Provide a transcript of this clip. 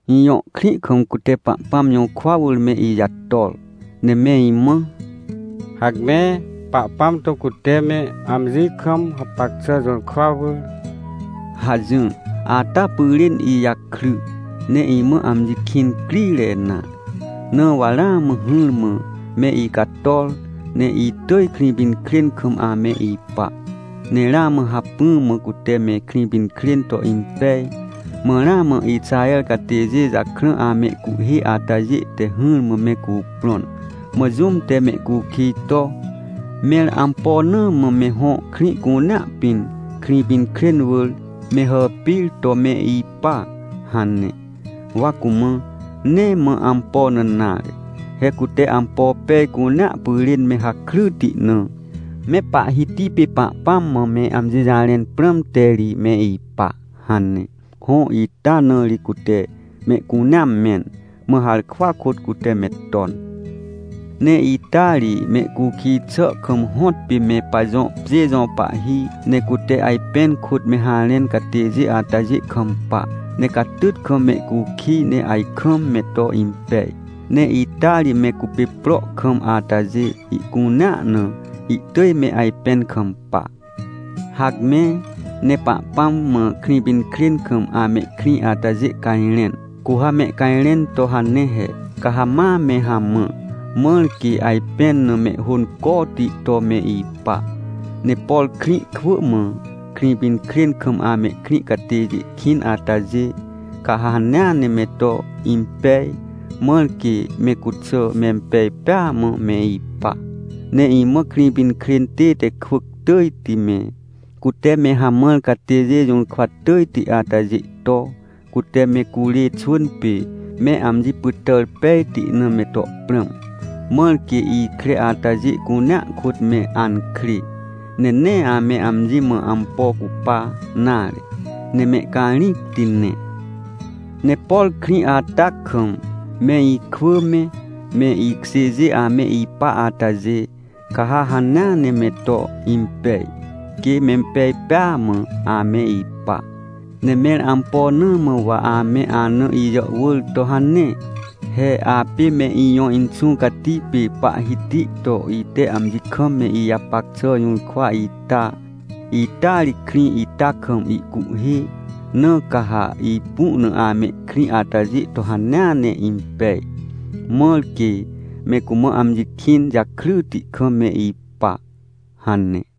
Ijõ krĩ kam cute Pahpãm jũrkwa wỳr me ijator, ne me imã: “Hacme, Pahpãm to cute me amji kam hapac xà jũrkwa wỳr!” hajỹr, ata pyrên ijakry, ne imã amji kĩn crire nare. Na wa ramã hỹrmã me icator, ne itỳj Krĩpinkrên kam ame ipa. Ne ramã hacpỹ mã cute me Krĩpinkrên to impej. Mã ramã Ixaher catêjê jakrã amehcuhhê atajê te hỹrmã me cuprõn. Mã jũm te mehcukij to, “Mẽr ampo na mã me hõ krĩ cunea pĩn, Krĩpinkrên wỳr, me hàpir to me ipa?” hane. Wa cumã: “Nee mã ampo na nare! He cute ampo pej cunea pyrên me hakryti na, me Pahhiti pê Pahpãm mã me amji jarẽn prãmte ri me ipa” hane. Hõ, ita na ri cute mehcunea mẽn, mã harkwa kôt cute me ton. Ne ita ri mehcukij xà kam hõtpê me pajõ pjê jõ pahhi. Ne cute ajpẽn kôt me harẽn catêjê atajê kampa, ne catyt kam mehcukij, ne ajkam me to impej. Ne ita ri me cupê pro kam atajê ihcunea na, ihtỳj me ajpẽn kampa. Hacme, ne Pahpãm mã Krĩpinkrên kam amehkrĩ atajê cajrẽn. Cu ha mehcajrẽn to hane he: “Ca ha ma me hamã, mãr quê ajpẽn na mehhôncoti to me ipa. Ne por krĩ kwỳ mã, Krĩpinkrên kam amehkrĩ catêjê kĩn atajê, ca ha hanea ne me to impej, mãr quê me cuxà mempej pêa mã me ipa. Ne imã Krĩpinkrên tête kwỳc tỳjti me, cute me hamãr catêjê jũrkwa tỳjti atajê to, cute me curê xwỳn pê, me amji pytàr pejti na me to prãm, mãr quê ikre atajê cunea kôt me ankrê, ne nee ame amji mã ampo cupa nare, ne mehcarĩcti ne. Ne por krĩ ata kam, me ikwỳ me, me ikjêjê ame ipa atajê, ca ha hanea ne me to impej, quê mempej pêa mã ame ipa. Ne mẽr ampo na mã wa ame ana ijàhwỳr to hane? He apê me ijõ Inxũ Cati pê Pahhiti to ite amji kam me ijapac xà jũrkwa ita, ita ri krĩ ita kam ihcuhhê, na ca ha ipu na amehkrĩ atajê to hanea ne impej, mãr quê me cumã amji kĩn jakryti kam me ipa” hane.